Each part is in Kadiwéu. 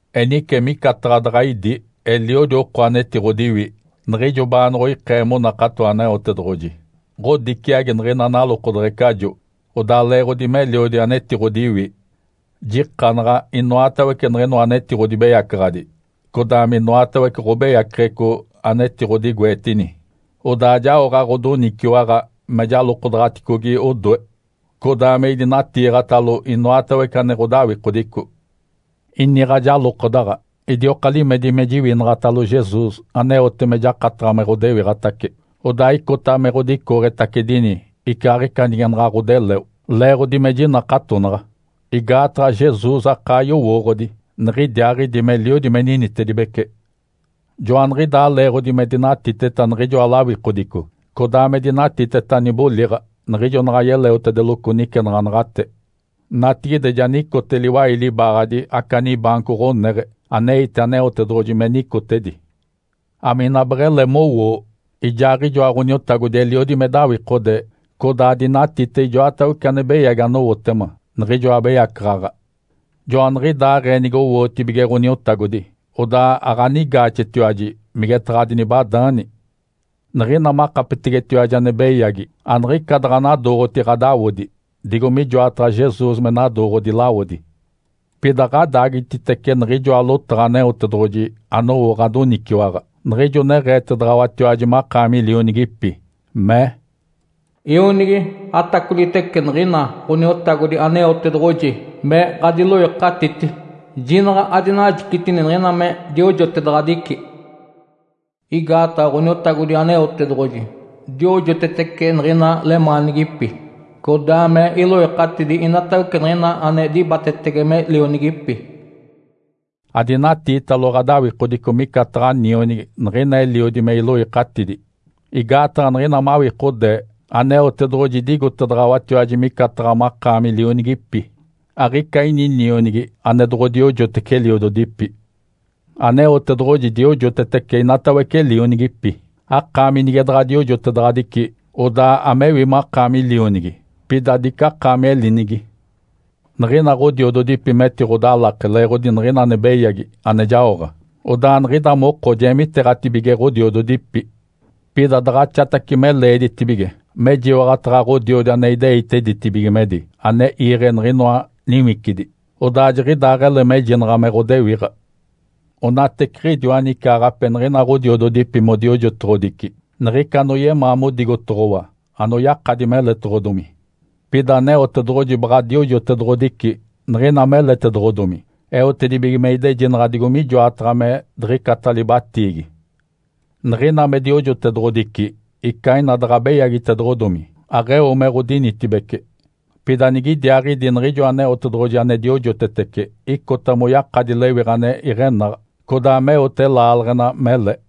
Enice micataɡ̶a daɡ̶a idi eliodi oko anetiɡ̶odiwi, niɡ̶ijo baanoɡ̶oikee monakato Aneotedoɡ̶oji, ɡ̶odiciagi niɡ̶ina nalokodeɡ̶ecajo. Odaa leeɡ̶odi meliodi anetiɡ̶odiwi, jikanaɡ̶aticoace inoatawece niɡ̶inoa anetiɡ̶odibeyacaɡ̶adi, codaa minoatawece ɡ̶obeyaceɡ̶eco anetiɡ̶odigoetini, odaa jaoɡ̶a ɡ̶odoniciwaɡ̶a me jalokodaɡ̶aticogi odoe, codaa me idinatiiɡ̶atalo inoatawece ame ɡ̶odawikodico. Iniɡ̶a jalokodaɡ̶a, idioka limedi me jiwinaɡ̶atalo Jesus aneote me jakataɡ̶a me ɡ̶odewiɡ̶atace, odaa icota me ɡ̶odicooɡ̶etacedini icaaɡ̶ica nige naɡ̶a ɡ̶odeleo, leeɡ̶odi me jinakatonaɡ̶a. Igaataɡ̶a Jesus akaa yowooɡ̶odi niɡ̶idiaaɡ̶idi meliodi me ninitedibece. Joaniɡ̶idaa leeɡ̶odi me dinatiteta niɡ̶ijoa lawikodico, codaa me dinatiteta niboliɡ̶a niɡ̶ijo naɡ̶a yeleotedeloco nicenaɡ̶anaɡ̶ate. Natigide ja nicote liwai libaaɡ̶adi aca nibaanco ɡ̶oneɡ̶e aneite Aneotedoɡ̶oji me nicotedi. Amina beɡ̶ele mowoo. Ijaaɡ̶ijoa Ǥoniotagodi, eliodi me dawikode codaa dinatite ijoatawece ane beyagi anowotema niɡ̶ijoa abeyacaɡ̶aɡ̶a. Joaniɡ̶idaaɡ̶ee nigowootibige Ǥoniotagodi, odaa aɡ̶anigaaxetiwaji migetaɡ̶a adinibadaani. Niɡ̶ina makapetegetiwaji ane beyagi, aniɡ̶ica daɡ̶anadooɡ̶oti ɡ̶adawodi, digo mijoataɡ̶a Jesus me nadooɡ̶odi lawodi. Pida ɡ̶adaagititece niɡ̶ijoa lotaɡ̶a Aneotedoɡ̶oji anowo ɡ̶adoniciwaɡ̶a, niɡ̶ijo neɡ̶eetedaɡ̶awatiwaji makaami lionigipi. Mee, “Ionigi, atacolitece niɡ̶ina Ǥoniotagodi Aneotedoɡ̶oji me ɡ̶adiloikatiti. Jinaɡ̶a adinajicitini niɡ̶ina me diojotedaɡ̶adici. Igaataɡ̶a Ǥoniotagodi Aneotedoɡ̶oji diojotetece niɡ̶ina lemaanigipi, codaa me iloikatidi inatawece niɡ̶ina ane dibatetege me lionigipi.” Adinatiitalo ɡ̶adawikodico micataɡ̶a nionigi niɡ̶ina eliodi me iloikatidi. Igaataɡ̶a niɡ̶ina mawikodee Aneotedoɡ̶oji idigotedaɡ̶awatiwaji micataɡ̶a makaami lionigipi. Aɡ̶ica ini nionigi ane doɡ̶odiojotece eliododipi. Aneotedoɡ̶oji diojotetece inatawece lionigipi. Akaami nige daɡ̶a diojotedaɡ̶adici, odaa amewi makaami lionigi, pida dicakaami elinigi. Niɡ̶ina ɡ̶odiododipi metiɡ̶odalake leeɡ̶odi niɡ̶ina ane beyagi ane jaoɡ̶a, odaa niɡ̶ida moko jeemiteeɡ̶atibige ɡ̶odiododipi. Pida daɡ̶axatace me leeditibige mejiwaɡ̶ataɡ̶a Ǥodiodi ane ideite ditibigimedi ane iiɡ̶e niɡ̶inoa niwicidi, odaa jiɡ̶idaaɡ̶ele mejinaɡ̶a me ɡ̶odewiɡ̶a. Onateciɡ̶idiwa nicaaɡ̶ape niɡ̶ina ɡ̶odiododipi modiojotoɡ̶odici niɡ̶ica anoyemaa modigotoɡ̶owa anoyakadi meletoɡ̶odomi. Pida Aneotedoɡ̶oji baɡ̶a diojotedoɡ̶odici niɡ̶ina meletoɡ̶odomi eotedibige me idejinaɡ̶a digo mijoataɡ̶a me diɡ̶icata libatiigi. Niɡ̶ina me diojotedoɡ̶odici, ica ina daɡ̶a beyagitoɡ̶odomi, aɡ̶eo me ɡ̶odinitibece. Pida nigidiaaɡ̶idi, niɡ̶ijo Aneotedoɡ̶oji ane diojotetece icota moyakadi lewiɡ̶a ane iɡ̶enaɡ̶a, codaa meote laaleɡ̶ena mele.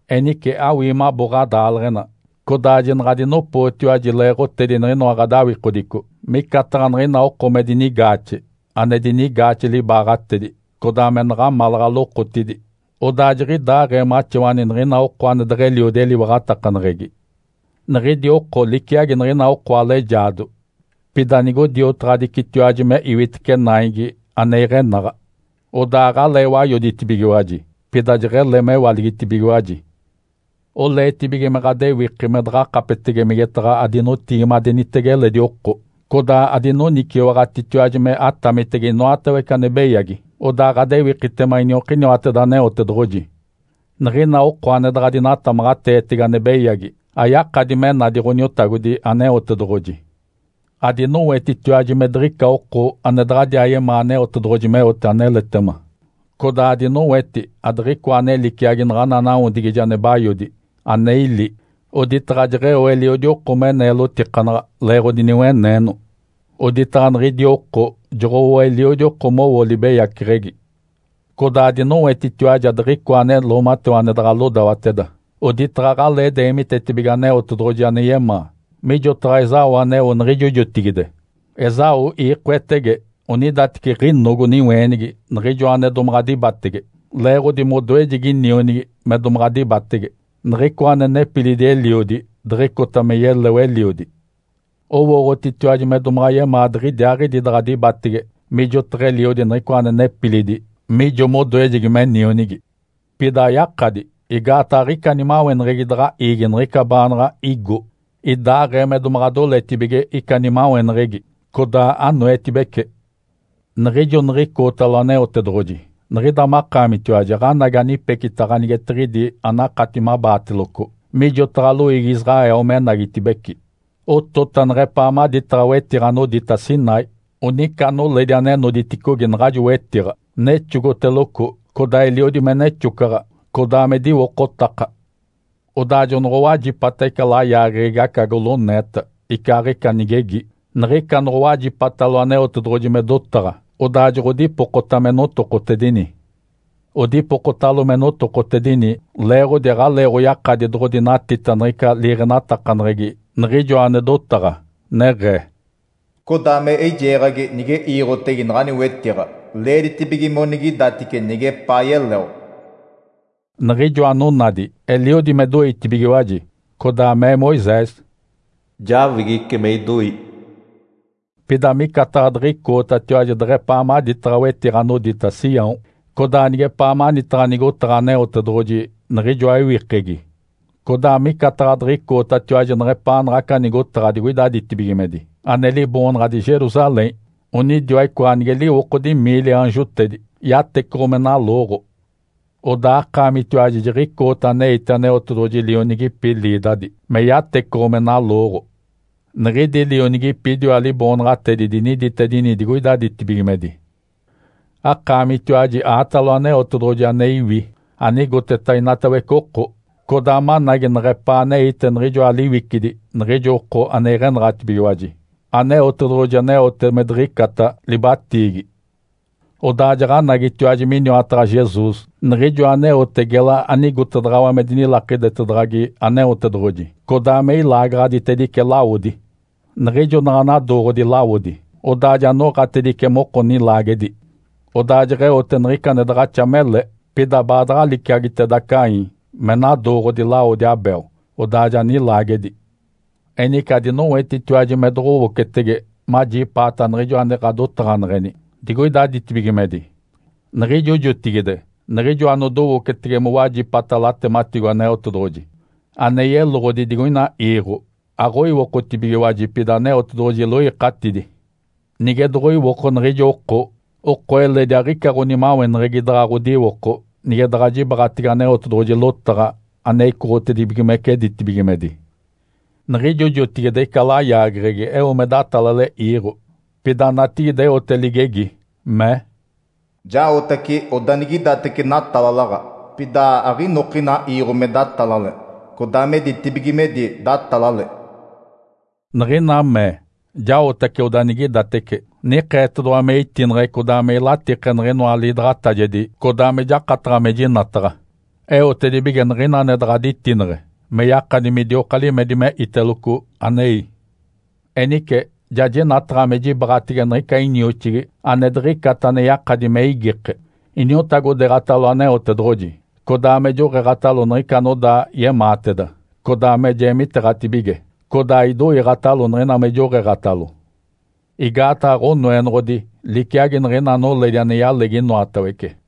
Enice awii mabo ɡ̶adaaleɡ̶ena, codaa jinaɡ̶adinopootiwaji leeɡ̶otedi niɡ̶inoa ɡ̶adawikodico, micataɡ̶a niɡ̶ina oko me dinigaaxe, ane dinigaaxe libaaɡ̶atedi, codaa me naɡ̶amalaɡ̶a lokotidi. Odaa jiɡ̶idaaɡ̶ee maxawani niɡ̶ina oko ane deɡ̶eliodi eliwaɡ̶atakaneɡ̶egi. Niɡ̶idi oko liciagi niɡ̶ina oko alejaado. Pida nigodiotaɡ̶adicitiwaji me iwitece naigi ane iɡ̶enaɡ̶a, Odaa aɡ̶alee wayoditibigiwaji, pida jeɡ̶ele mewaligitibigiwaji. Oleetibige me ɡ̶adewiki me daɡ̶akapetege migetaɡ̶a adinotigimadenitege eledi oko, codaa adinoniciwaɡ̶atitiwaji me atamitege inoatawece ane beyagi, odaa ɡ̶adewikitema iniokiniwateda Aneotedoɡ̶oji. Niɡ̶ina oko ane daɡ̶a dinatamaɡ̶ateetege ane beyagi ayakadi me nadi Ǥoniotagodi Aneotedoɡ̶oji. Adinowetitiwaji me diɡ̶ica oko ane daɡ̶adiaa yemaa Aneotedoɡ̶oji meote aneletema. Codaa adinoweti adiɡ̶icoa ane liciagi naɡ̶ana nawodigije ane bayodi, ane ili, oditaɡ̶a jeɡ̶eo eliodi oko me neelotikanaɡ̶a leeɡ̶odi niweneeno. Oditaɡ̶a niɡ̶idi oko joɡ̶owo eliodi oko mowo libeyaceɡ̶egi. Codaa adinowetitiwaji adiɡ̶icoa ane loomatewa ane daɡ̶a lodawateda, oditaɡ̶a aɡ̶alee deemitetibige Aneotedoɡ̶oji ane yemaa, mijotaɡ̶a Esaú aneo niɡ̶ijo jotigide. Esaú iikoetege onidateci ɡ̶inogo niweenigi niɡ̶ijoa ane domaɡ̶a dibatege, leeɡ̶odi modoejegi nionigi me domaɡ̶a dibatege, niɡ̶icoa ane nepilidi eliodi, diɡ̶icota me yeleo eliodi. Owooɡ̶otitiwaji me domaɡ̶a yemaa diɡ̶idiaaɡ̶idi daɡ̶a dibatege mijotaɡ̶a eliodi niɡ̶icoa ane nepilidi mijo modoejegi me nionigi. Pida ayakadi igaataɡ̶a aɡ̶ica nimaweneɡ̶egi daɡ̶a iigi niɡ̶ica baanaɡ̶a igo, idaaɡ̶ee me domaɡ̶a doletibige ica nimaweneɡ̶egi, codaa anoetibece. Niɡ̶ijo niɡ̶icootalo Aneotedoɡ̶oji, niɡ̶ida makaamitiwaji aɡ̶anagi anipecita ganigetiɡ̶idi anakati mabaateloco, mijotaɡ̶a loiigi Israel menagitibeci. Otota neɡ̶epaa maditaɡ̶a wetiɡ̶a anodita Sinai. Onica noledi ane noditicogi naɡ̶ajo wetiɡ̶a, nexogoteloco codaa eliodi me nexocaɡ̶a, codaa me diwocotaka. Odaa jonoɡ̶owajipata ica layaageɡ̶egi aca goloneeta icaaɡ̶ica nigegi. Niɡ̶ica noɡ̶owajipatalo Aneotedoɡ̶oji me dotaɡ̶a, odaa joɡ̶odipokota me notokotedini. Odipokotalo me notokotedini leeɡ̶odi aɡ̶aleeɡ̶oyakadi doɡ̶odinatita niɡ̶ica liiɡ̶enatakaneɡ̶egi Niɡ̶ijoa ane dotaɡ̶a, neɡ̶ee, “Codaa me eijeeɡ̶agi, nige iiɡ̶otege naɡ̶ani wetiɡ̶a, leeditibige monigidatice nigepaa yeleo.” Niɡ̶ijo anonadi eliodi me doitibigiwaji, codaa mee Moisés, “Jawigice me idoi.” Pida micataɡ̶a diɡ̶icootatiwaji deɡ̶epaa maditaɡ̶a wetiɡ̶a anodita Sião, codaa nigepaa manitaɡ̶a nigotaɡ̶a Aneotedoɡ̶oji, Niɡ̶ijoa ewikegi. Codaa micataɡ̶a diɡ̶icootatiwaji neɡ̶epaa naɡ̶aca nigotaɡ̶a digoida ditibigimedi, ane liboonaɡ̶adi Jerusalém, onidiwa icoa anige liwokodi miili aanjotedi, yatecoɡ̶o me nalooɡ̶o. Odaa akaamitiwaji jiɡ̶icoota aneite Aneotedoɡ̶oji lionigipi liidadi me yatecoɡ̶o me nalooɡ̶o. Niɡ̶idi lionigipi idiwa liboonaɡ̶atedi diniditedini digoida ditibigimedi. Akaamitiwaji aatalo Aneotedoɡ̶oji ane iwi anigoteta inatawece oko, codaa managi neɡ̶epaa aneite niɡ̶ijoa liwicidi niɡ̶ijo oko ane iɡ̶enaɡ̶atibigiwaji, Aneotedoɡ̶oji aneote me diɡ̶icata libatiigi. Odaa jaɡ̶anagitiwaji miniwataɡ̶a Jesus, Niɡ̶ijoa aneote gela anigotedaɡ̶awa me dinilakidetedaɡ̶agi Aneotedoɡ̶oji, codaa me ilaagaɡ̶aditedice lawodi. Niɡ̶ijo naɡ̶a nadooɡ̶odi lawodi, odaa ja noɡ̶atedice moko nilaagedi, odaa jeɡ̶eote niɡ̶ica ane daɡ̶axa mele, pida baadaɡ̶a liciagiteda Caim me nadooɡ̶odi lawodi Abel, odaa ja nilaagedi. Enice adinowetitiwaji me doɡ̶owocetege majipaata Niɡ̶ijo ane ɡ̶adotaɡ̶aneɡ̶eni digoida ditibigimedi. Niɡ̶ijo jotigide, niɡ̶ijo anodowocetege mowajipata latematigo Aneotedoɡ̶oji ane yeloɡ̶odi digoina iiɡ̶o, aɡ̶oiwokotibigiwaji, pida Aneotedoɡ̶oji iloikatidi. Nige doɡ̶oiwoko niɡ̶ijo oko, oko eledi aɡ̶ica ɡ̶onimaweneɡ̶egi daɡ̶a ɡ̶odiwoko nige daɡ̶a jibaɡ̶atege Aneotedoɡ̶oji lotaɡ̶a ane icoɡ̶otedibigimece ditibigimedi. Niɡ̶ijo jotigide ica layaageɡ̶egi eo me datalale iiɡ̶o. Pida natigide eote ligegi, mee, “Jaotace odanigidatece natalalaɡ̶a, pida aɡ̶inokina iiɡ̶o me datalale, codaa me ditibigimedi datalale.” Niɡ̶ina mee, “Jaotace odanigidatece”, nikeetedoɡ̶owa me itineɡ̶e codaa me ilatike niɡ̶inoa ane liidaɡ̶atajegi codaa me jakataɡ̶a me jinataɡ̶a, eotedibige niɡ̶ina ane daɡ̶a ditineɡ̶e me yakadi midioka limedi me iteloco anei. Enice, ja jinataɡ̶a me jibaɡ̶atege niɡ̶ica inioxigi ane diɡ̶icata ane yakadi me igike, iniotagodeeɡ̶atalo Aneotedoɡ̶oji, codaa me joɡ̶eeɡ̶atalo niɡ̶ica anodaa yemaateda, codaa me jeemiteeɡ̶atibige, codaa idoiiɡ̶atalo niɡ̶ina me joɡ̶eeɡ̶atalo. Igaataɡ̶a Ǥonoenoɡ̶odi liciagi niɡ̶ina noledi ane yalegi inoatawece.